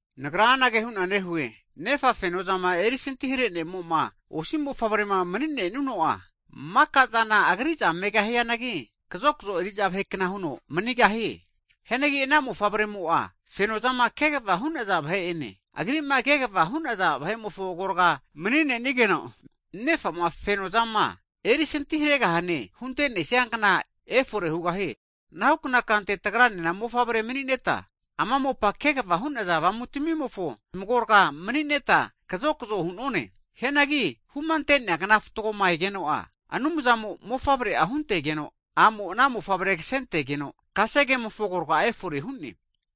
Nagra anage hu'na nehue, nefa fenozama erisantihare ne'mo'ma osi mofavrema mni'nenuno'a, maka'zana agri'za megahianagi, kazokzo eri'za vahekna huno manigahie. Hianagi ana mofavremo'a fenozama kegva hu'naza vahe'ene, agri'ma kegva hu'naza vahe'mofo agorga'a mni'nenigeno, nefa'ma fenozama erisanti haregahane hunte'nesia kna efore hugahie. Anahukna kante tagranena mofavrema mni'neta, ama mopama kegva hu'naza avamutamimofo zmagorga'a mni'neta kazokzo hu'nonane. Hianagi humante'nea kna fatgoma egeno'a, Anumzamo Mofavre'a huntegeno, a'mo ana Mofavre kasentegeno, kasegemofo agorga efore hu'ne.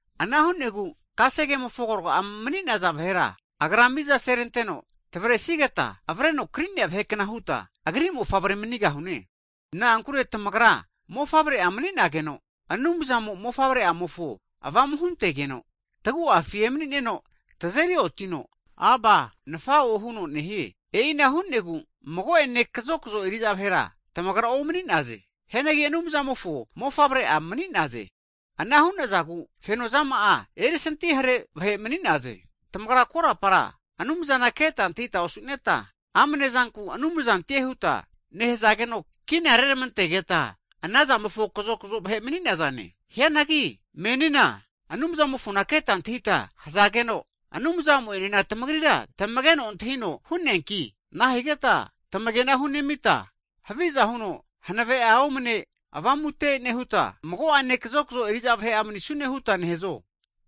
Ana hu'negu kasegemofo agorga mni'naza vahera, Agra mizaseranteno tamavresigeta, avreno kri'nea vahekna huta, Agri mofavre manigahune. Na'ankure tamagra mofavre'a mani'nageno, Anumzamo Mofavre'amofo Avamu huntegeno, tagu'afi emani'neno tazeri otino, Aba, Nafa'o huno nehie. E'ina hu'negu mago'ene kazokzo eri'za vahera tamagra omani'naze. Hianagi Anumzamofo mofavre'a mni'naze. Ana hu'nazagu fenozama'a erisantihare vahe mni'naze. Tamagra korapara Anumzana keta antahita osu'neta, amne zanku, anumzantie huta nehazageno, kina reramantegeta anazamofo kazokzo vahe mni'nazane. Hianagi menina Anumzamofona keta antahita hazageno, Anumzamo'enena tamagrira tamegeno antahino hu'neanki, nahigeta tamagena hunemita, haviza huno hanave'a omne avamute nehuta, mago'ane kazokzo eri'za vahe'a manisune huta nehazo?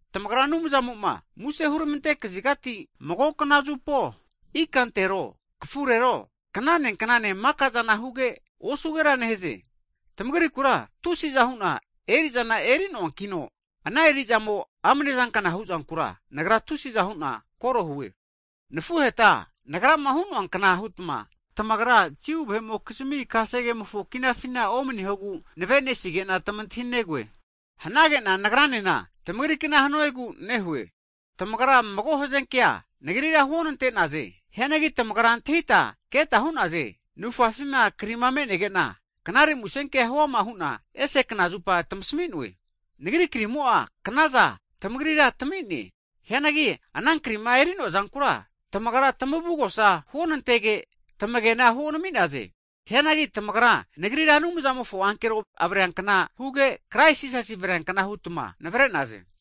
Tamagra Anumzamo'ma muse huramante kazigati, mago knazupo, ikantero, kafurero, knane knanena makazana huge, osugera nehaze. Tamagrikura tusi'za hu'na eri'zana eri'noankino, ana eri'zamo amnezankna huzankura nagra tusiza hu'na kore hue. Nafuheta nagrama hu'noankna hutma, tamagra Jiu vahe'mokizmi kasegemofo kinafina omnihogu navenesige'na tamantahinegoe, hanage'na nagranena tamagrikna hanuegu nehue. Tamagra mago hazenkea nagrira huonante'naze. Hianagi tamagra antahita keta hu'naze. Navufafina kri me'nege'na, knare musenkea huama hu'na ese knazupa tamasami'noe. Nagri krimo'a knaza tamagrira tami'ne, hianagi ana krima eri'noazankura tamagra tamavugosa huonantege, tamagena huonami'naze. Hianagi tamagra nagrira Anumzamofo ankero avreankna huge, Kraisi Jisas avreankna hutma navre'naze.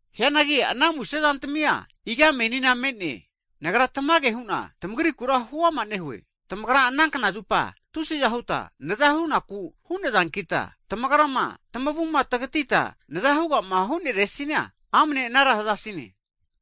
Hianagi ana musezantamia iga menina me'ne? Nagra tamage hu'na tamagrikura huama nehue. Tamagra ana knazupa tusiza huta nazahunaku hu'nazankita, tamagrama tamavuma tagatita nazamahugama huneresina, amne anara hazasine.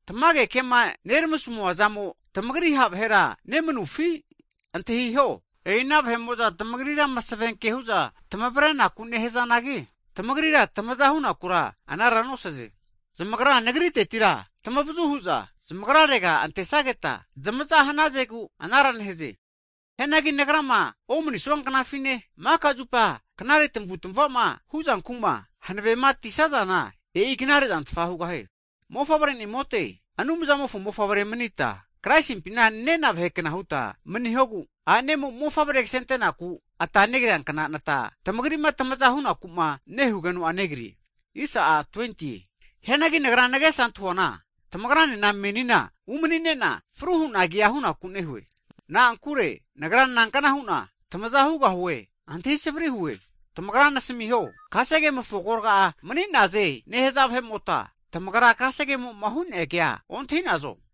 Tamage kema neramasamuazamo, tamagri ha' vahera nemanufi? Antahiho, e'i ana vahe'mo'za tamagrira masavenke hu'za tavrenaku nehazanagi, tamagrira tamaza hunakura anara nosaze. Zamagra nagriteti tamavazu hu'za zamagrarega antesageta zmaza hnazegu anara nehaze. Hianagi nagrama omnisua knafine, maka zupa knare tamavutmava'ma huzanku'ma hanavematisazana, e'i knare zantfa hugahie. Mofavre'nimote Anumzamofo mofavre'manita, Kraisimpina nena vahekna hutma maniho. Tamagri'ma tamaza hunaku'ma nehugeno'a a'nemo mofavre kasentenaku ata negriankna nata negrie. Hianagi nagra nagesa antahuana tamagrane menina umani'ne'na, fruhuna kea hu'naku nehue. Na'ankure nagra nankna hu'na tamaza hugahue, antahintahinimo'a savri hue. Tamagra nasmiho, kasegemofo agorga'a manize nehaze vahe'mota, tamagra kasegemo'ma hu'nea kea ontahinazo?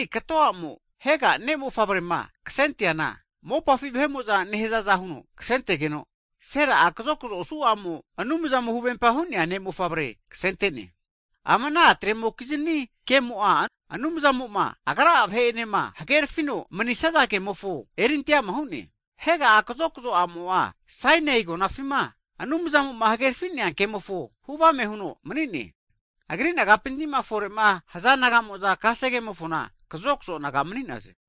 Hianagi kato a'mo Hega ne' mofavrema ksente'neana mopafi vahe'mo'za nehazaza huno ksentegeno, Sera'a kazokzo osu a'mo'a Anumzamo huvempa hu'nea ne' mofavre ksente'ne. Ama ana a'tremokizni kemo'a Anumzamo'ma Agra'a vahe'enema hagerafino manisaza kemofo erinte'ama hu'ne. Hega'a kazokzo a'mo'a Sainai agonafima Anumzamo'ma hagerafinea kemofo hu avame huno mani'ne. Agri nagapintima fore'ma haza nagamo'za kasegemofona kazokzo naga mani'naze.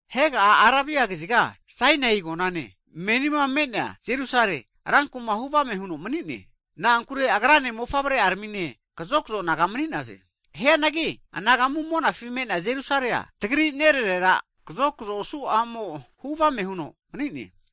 Hega'a Arabia kaziga Sainai agonane, menima me'nea Jerusale rankuma hu avame huno mani'ne. Na'ankure agrane mofavre'aramine kazokzo naga mani'naze. Hianagi anagamu monafi me'nea Jerusalea, tagri nerarera kazokzo osu a'mo hu avame huno mani'ne.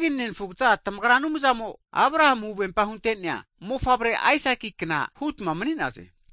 Hagi nenafugata, tamagra Anumzamo Abrahamu huvempa hunte'nea mofavre Aisakinkna hutma mani'naze.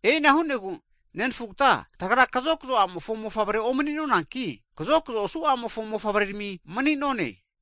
E'ina hu'negu nenafugata, tagra kazokzo a'mofo mofavrea omni'nonanki, kazokzo osu a'mofo mofavre'rami mani'none.